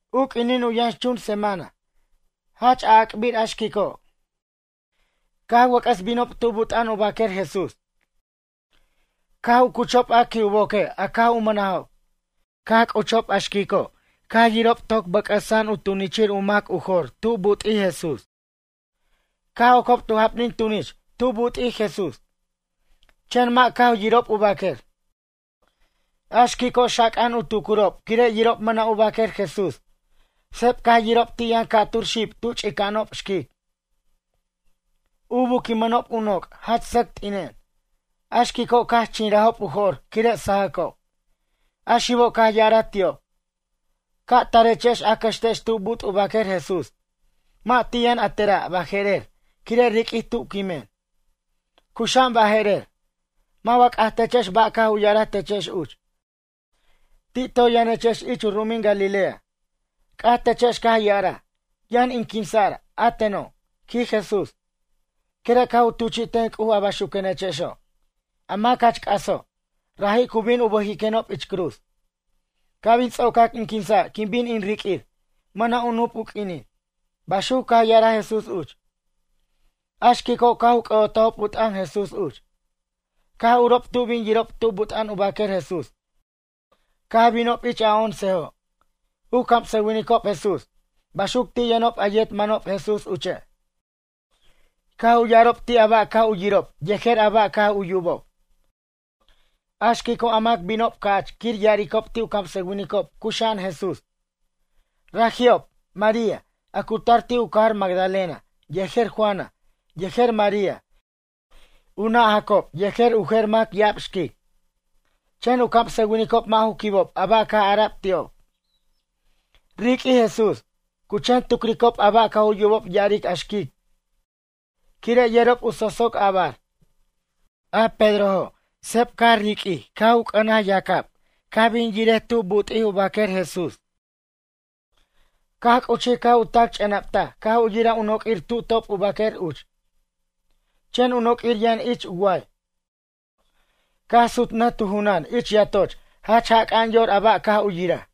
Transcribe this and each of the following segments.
U q'uinin u yʌnxchun semana, jach a'ac'bir a xquico' caj wʌc'ʌs binob tu but' u baquer Jesús. Caj u cuchob a qui' u boque a caj u mʌnajob. Caj c'uchob a xquico' caj yirob toc bʌc'ʌsa'an u tunichir u mac u jor tu but'ij Jesús. Caj ocob tu japnin tunich tu but'ij Jesús. Chen mʌ' caj u yirob u baquer. A xquico' xaca'an u tucurob quire' yirob mʌna' u baquer Jesús. Seb caj yirob ti' yʌn ca'tur xib tu ch'ica'anob xquic. U buquimʌnob u noc' jach sʌc t'inen. A xquico' caj chinrajob u jo'r quire' sajʌcob. A xibo' caj ya'araj ti'ob: ―Ca tarechex a cʌxtex tu but' u baquer Jesús? Mʌ' ti' yʌn a tera' baje'rer quire' riq'uij tu quimen, cuxa'an baje'rer. Mʌ' wa c'ajtechex ba' caj u ya'araj techex uch. Ti' toy yʌnechex ich u ru'umin Galilea. C'ajtechex caj ya'araj: “Yʌn in quinsa'r, a teno', quij Jesús, quire' caj u tuchi'ten C'uj a baxuquechexo'. A mac jach c'aso', raji' cu bin u bʌjiquenob ich cruz. Ca' bin ts'ocac in quinsa' quin bin in riq'uir, mʌna' u nup u q'uinin.” Baxuc caj ya'araj Jesús uch. A xquico' caj u c'ʌ'otajob u t'ʌn Jesús uch. Caj urob tu bin yirob tu but' u baquer Jesús caj binob ich a oncejo' u camsʌwinicob Jesús. Baxuc ti' yʌnob a yet manob Jesús uche'. Caj u ya'arob ti' a ba' caj u yirob yejer a ba' caj u yubob. A xquico' a mac binob ca'ch quir ya'aricob ti' u camsʌwinicob cuxa'an Jesús. Raji'ob, María, a cu tar ti' u cajar Magdalena, yejer Juana, yejer María, u nʌ' Jacob yejer u jer mʌ' ya'ab xquic. Chen u camsʌwinicob mʌ' ju quibob a ba' caj ara'b ti'ob: “Riq'uij Jesús.” Cu chen tucricob a ba' caj u yubob ya'aric a xquic quire' yerob u sosoc a'bar. A Pedrojo', seb caj riq'uij caj u c'ʌnaj yacab caj bin yiric tu but'ij u baquer Jesús. Caj c'uchij caj u tac ch'enaptaj caj u yiraj u noq'uir tu top u baquer uch. Chen u noq'uir yʌn ich u way. Caj sutnʌj tu junan ich yatoch jach jac'a'an yor a ba' caj u yiraj.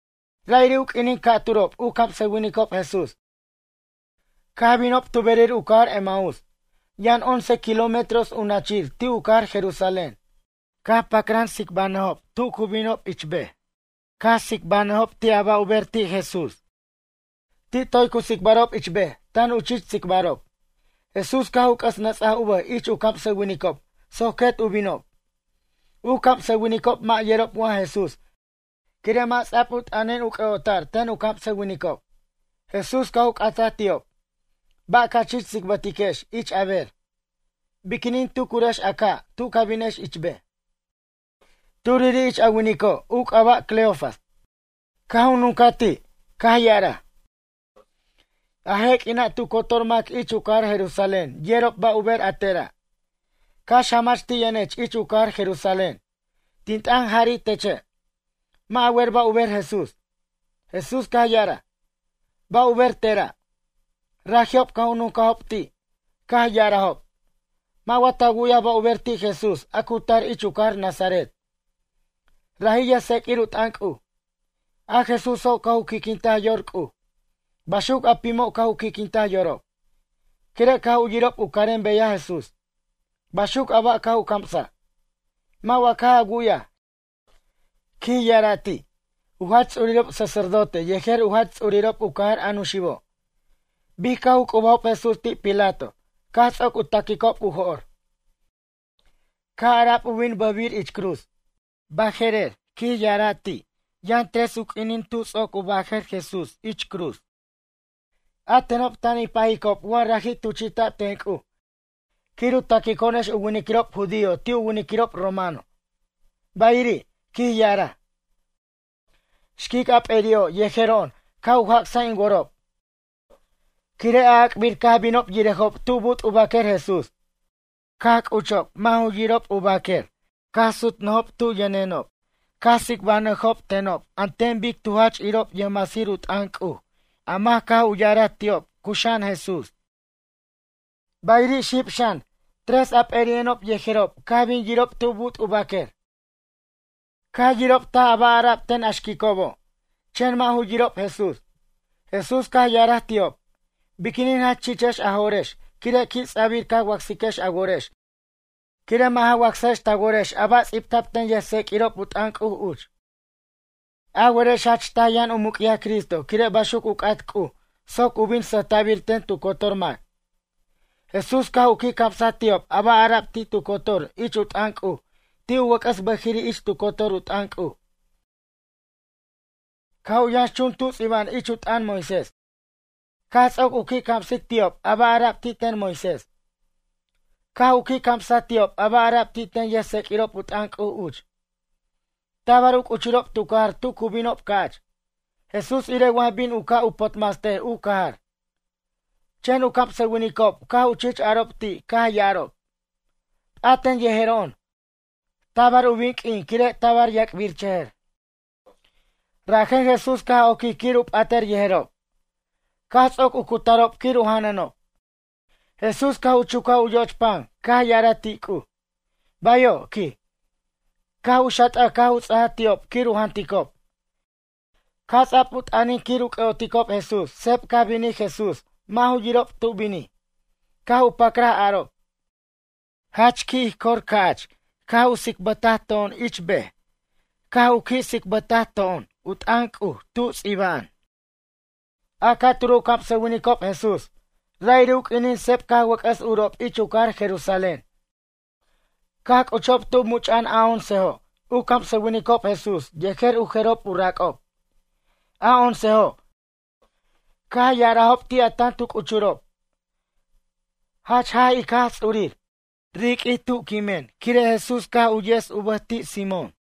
Ra'iri' u q'uinin ca'turob u camsʌwinicob Jesús, caj binob tu berir u cajar Emaús. Yʌn once kilómetros u nachir ti' u cajar Jerusalén. Caj pacran tsicbnʌjob tu cu binob ich bej. Caj tsicbnʌjob ti' a ba' u ber ti' Jesús. Ti' toy cu tsicbarob ich bej tan u chich tsicbarob. Jesús caj u c'ʌs nʌts'aj u bʌj ich u camsʌwinicob soc quet u binob. U camsʌwinicob mʌ' yerob wa Jesús quire' mʌ' ts'a'b u t'ʌnin u c'ʌ'ota'r ten u camsʌwinicob. Jesús caj u c'ataj ti'ob: ―Ba' ca chich tsicbʌtiquex ich a ber? Biquinin tucurex a caj tu ca binex ich bej? Turiri' ich a winico' u c'aba' Cleofas caj u nuncaj ti' caj ya'araj: ―A je' q'uina' tu cotor mac ich u cajar Jerusalén yerob ba' u ber a tera'. Cax jamach ti' yʌnech ich u cajar Jerusalén. Tin t'ʌn jari' teche', mʌ' a wer ba' u ber Jesús. Jesús caj ya'araj: ―Ba' u ber tera'? Raji'ob caj u nuncajob ti', caj ya'arajob. Mʌ' wa ta wu'yaj ba' u ber ti' Jesús a cu tar ich u cajar Nazaret? Raji' yʌjtseq'uir u t'ʌn C'uj. A Jesúso' caj u qui'quintaj yor C'uj. Baxuc a pimo' caj u qui'quintaj yorob. Quire' caj u yirob u carem beyaj Jesús. Baxuc a ba' caj u camsaj. Mʌ' wa caj a wu'yaj ―quij ya'ara' ti'― u jach ts'urirob sacerdote yejer u jach ts'urirob u cajar a nuxibo', bic caj u c'ubajob Jesús ti' Pilato caj ts'oc u ta'quicob u jo'r. Caj ara'b u bin bʌjbir ich cruz. Baje'rer ―quij ya'ara' ti'―, yʌn tres u q'uinin tu ts'oc u bajʌr Jesús ich cruz. A tenob tan in pajicob wa raji' tuchi'ta'b ten C'uj quir u taquico'onex u winiquirob judío ti' u winiquirob romano. Bayiri' ―quij ya'araj―, xquic a p'eri'o' yejero'on caj u jac's in worob quire' a'ac'bir caj binob yirejob tu but' u baquer Jesús. Caj c'uchob mʌ' ju yirob u baquer, caj sutnʌjob tu yʌnenob caj tsicbʌnʌjob tenob an ten bic tu jach irob yʌjmasir u t'ʌn C'uj a mac caj u ya'araj ti'ob cuxa'an Jesús. Bayiri' xib xan tres a p'eri'o'enob yejerob caj bin yirob tu but' u baquer. Caj yirob taj a ba' ara'b ten a xquicobo'. Chen mʌ' ju yirob Jesús. Jesús caj ya'araj ti'ob: ―Biquinin jach chichex a jo'rex quire' qui' ts'abir ca wacsiquex a worex quire' mʌ' ja wacsajex ta worex a ba' ts'ibta'b ten yʌjtseq'uirob u t'ʌn C'uj uch. A werex jach taj yʌn u muc'yaj Cristo quire' baxuc u c'at C'uj soc u bin sʌjta'bir ten tu cotor mac. Jesús caj u qui' camsaj ti'ob a ba' ara'b ti' tu cotor ich u t'ʌn C'uj ti' u wʌc'ʌs bʌjiri' ich tu cotor u t'ʌn C'uj. Caj u yʌnxchun tub ts'iba'an ich u t'ʌn Moisés. Caj ts'oc u qui' camsic ti'ob a ba' ara'b ti' ten Moisés. Caj u qui' camsaj ti'ob a ba' ara'b ti' ten yʌjtseq'uirob u t'ʌn C'uj uch. Tabar u c'uchurob tu cajar tu cu binob ca'ch. Jesús irej wa bin u ca' u potmastej u cajar. Chen u camsʌwinicob caj u chich arob ti' caj ya'arob: ―P'aten yejero'on, tabar u bin q'uin quire' tabar u yac'birchʌjʌr. Rajen Jesús caj oquij quir u p'atʌr yejerob. Caj ts'oc u cutarob quir u janʌnob. Jesús caj u chucaj u yoch pan caj ya'araj ti' C'uj: ―Bayo' ―quij. Caj u xat'aj caj u ts'aj ti'ob quir u janticob. Caj ts'a'b u t'ʌnin quir u c'ʌ'oticob Jesús seb caj binij Jesús mʌ' ju yirob tu binij. Caj u pacraj arob: ―Jach qui' ij cor ca'ch caj u tsicbʌta to'on ich bej, caj u qui' tsicbʌta to'on u t'ʌn C'uj, tu ts'iba'an. A ca'turo' u camsʌwinicob Jesús, ra'iri' u q'uinin seb caj wʌc'ʌs urob ich u cajar Jerusalén. Caj c'uchob tu much'a'an a oncejo' u camsʌwinicob Jesús yejer u jerob u rac'ob. A oncejo' caj ya'arajob ti' a tan tu c'uchurob: ―Jach jaj ic Jaj Ts'ur, riq'uij tu quimen quire' Jesús caj tu yes u bʌj ti' Simón.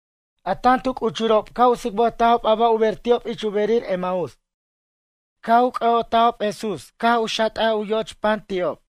A tan tu c'uchurob caj u tsicbʌtajob a ba' u ber ti'ob ich u berir Emaús. Caj u c'ʌ'otajob Jesús caj xat'aj u yo'och pan ti'ob.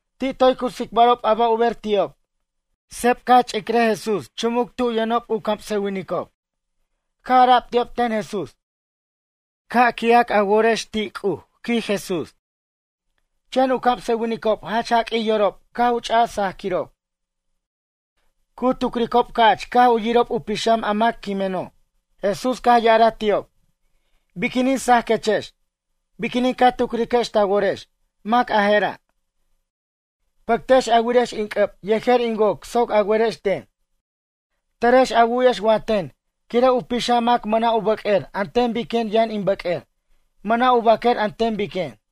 Ti' toy cu tsicbarob a ba' u ber ti'ob. Seb caj ch'icraj Jesús chumuc tu yʌnob u camsʌwinicob. Caj ara'b ti'ob ten Jesús: ―Ca' qui'ac a worex ten C'uj ―quij Jesús. Chen u camsʌwinicob jach jaq'uij yorob caj u ch'aj sajquirob. Cu tucricob ca'ch caj u yirob u pixam a mac quimeno'. Jesús caj ya'araj ti'ob: ―Biquinin sajquechex? Biquinin ca tucriquex ta worex: Mac a je'ra'? Pʌctex a wirex in c'ʌb yejer in woc soc a werex ten. Tʌrex a wu'yex wa ten quire' u pixam mac mʌna' u bʌq'uer an ten biquen yʌn in bʌq'uer. Mʌna' u baquer an ten biquen.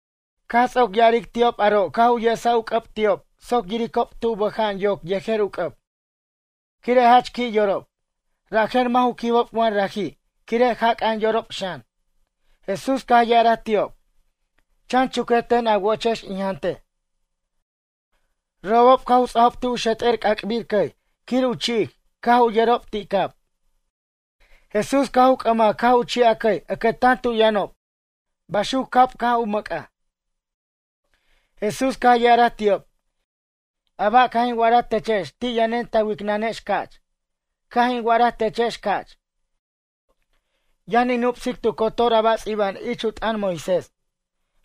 Caj ts'oc ya'aric ti'ob aro' caj u yesaj u c'ʌb ti'ob soc yiricob tu bʌja'an yoc yejer u c'ʌb. Quire' jach qui' yorob, rajen mʌ' ju quibob wa raji' quire' jac'a'an yorob xan. Jesús caj ya'araj ti'ob: ―Chan chuquej ten a wochex in jantej. Robob caj u ts'ajob ti' u xet'er c'ac'bir cʌy quir u chi'ic caj u yʌrob ti' cab. Jesús caj u c'ʌmaj caj u chi'aj cʌy ʌcʌtan tu yʌnob baxuc cab caj u mʌc'aj. Jesús caj ya'araj ti'ob: ―A ba' caj in wa'araj techex ti' yʌnen ta wicnʌnex ca'ch. Caj in wa'araj techex ca'ch, yʌn in nupsic tu cotor a bar ts'iba'an ich u t'ʌn Moisés.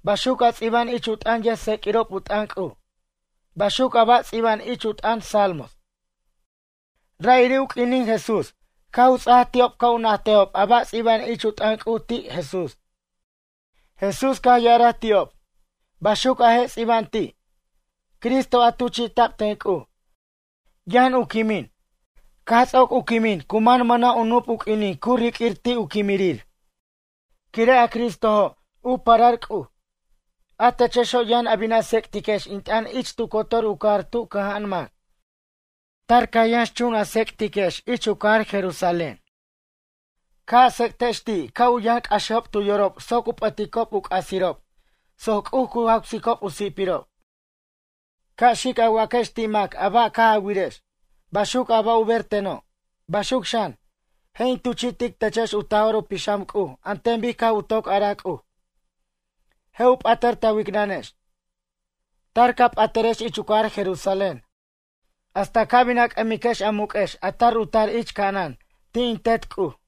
Baxuc a ts'iba'an ich u t'ʌn yʌjtseq'uirob u t'ʌn C'uj. Baxuc a ba' ts'iba'an ich u t'ʌn salmos. Ra'iri' u q'uinin Jesús caj u ts'aj ti'ob ca' u najtejob a ba' ts'iba'an ich u t'ʌn C'uj ti' Jesús. Jesús caj ya'araj ti'ob: ―Baxuc a je' ts'iba'an ti': “Cristo a tuchi'ta'b ten C'uj. Yʌn u quimij, caj ts'oc u quimij cu man mʌna' u nup u q'uinin cu riq'uir ti' u quimirir, quire' a Cristojo', u parar C'uj. A techexo' yʌn a bin a tsec'tiquex in t'ʌn ich tu cotor u cajar tu cʌja'an mac. Tar ca yʌnxchun a tsec'tiquex ich u cajar Jerusalén. Ca' a tsec'tex ti' ca' u yʌn c'axejob tu yorob soc u p'ʌticob u c'asirob soc C'uj cu jawsiob u si'pirob.” Ca' xic a waquex ti' mac a ba' caj a wirex, baxuc a ba' u ber teno'. Baxuc xan, je' in tuchi'tic techex u Taj'or u Pixam C'uj an ten bic caj u toc araj C'uj. Je' u p'atʌr ta wicnʌnex. Tar ca p'atʌrex ich u cajar Jerusalén hasta ca' bin a c'ʌmiquex a muq'uex a tar u tar ich ca'anan ti' in Tet C'uj.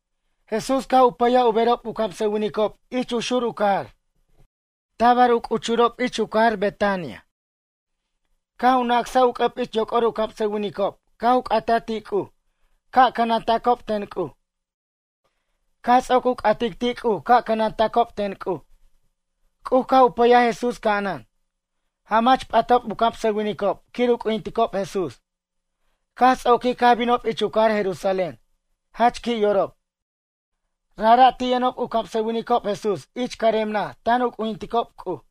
Jesús caj u pʌyaj u berob u camsʌwinicob ich u xur u cajar. Tabar u c'uchob ich cajar Betania. Caj u nacsaj u c'ʌb ich yoc'or u camsʌwinicob caj u c'ataj ti' C'uj ca' cʌnantacob ten C'uj. Caj ts'oc u c'atic ti' C'uj ca' cʌnantacob ten C'uj, C'uj caj u pʌyaj Jesús ca'anan. Jamach p'atob u camsʌwinicob quir u c'ujinticob Jesús. Caj ts'oquij caj binob ich u cajar Jerusalén, jach qui' yorob. Rajra' ti' yʌnob u camsʌwinicob Jesús ich carem naj tan u c'ujinticob C'uj.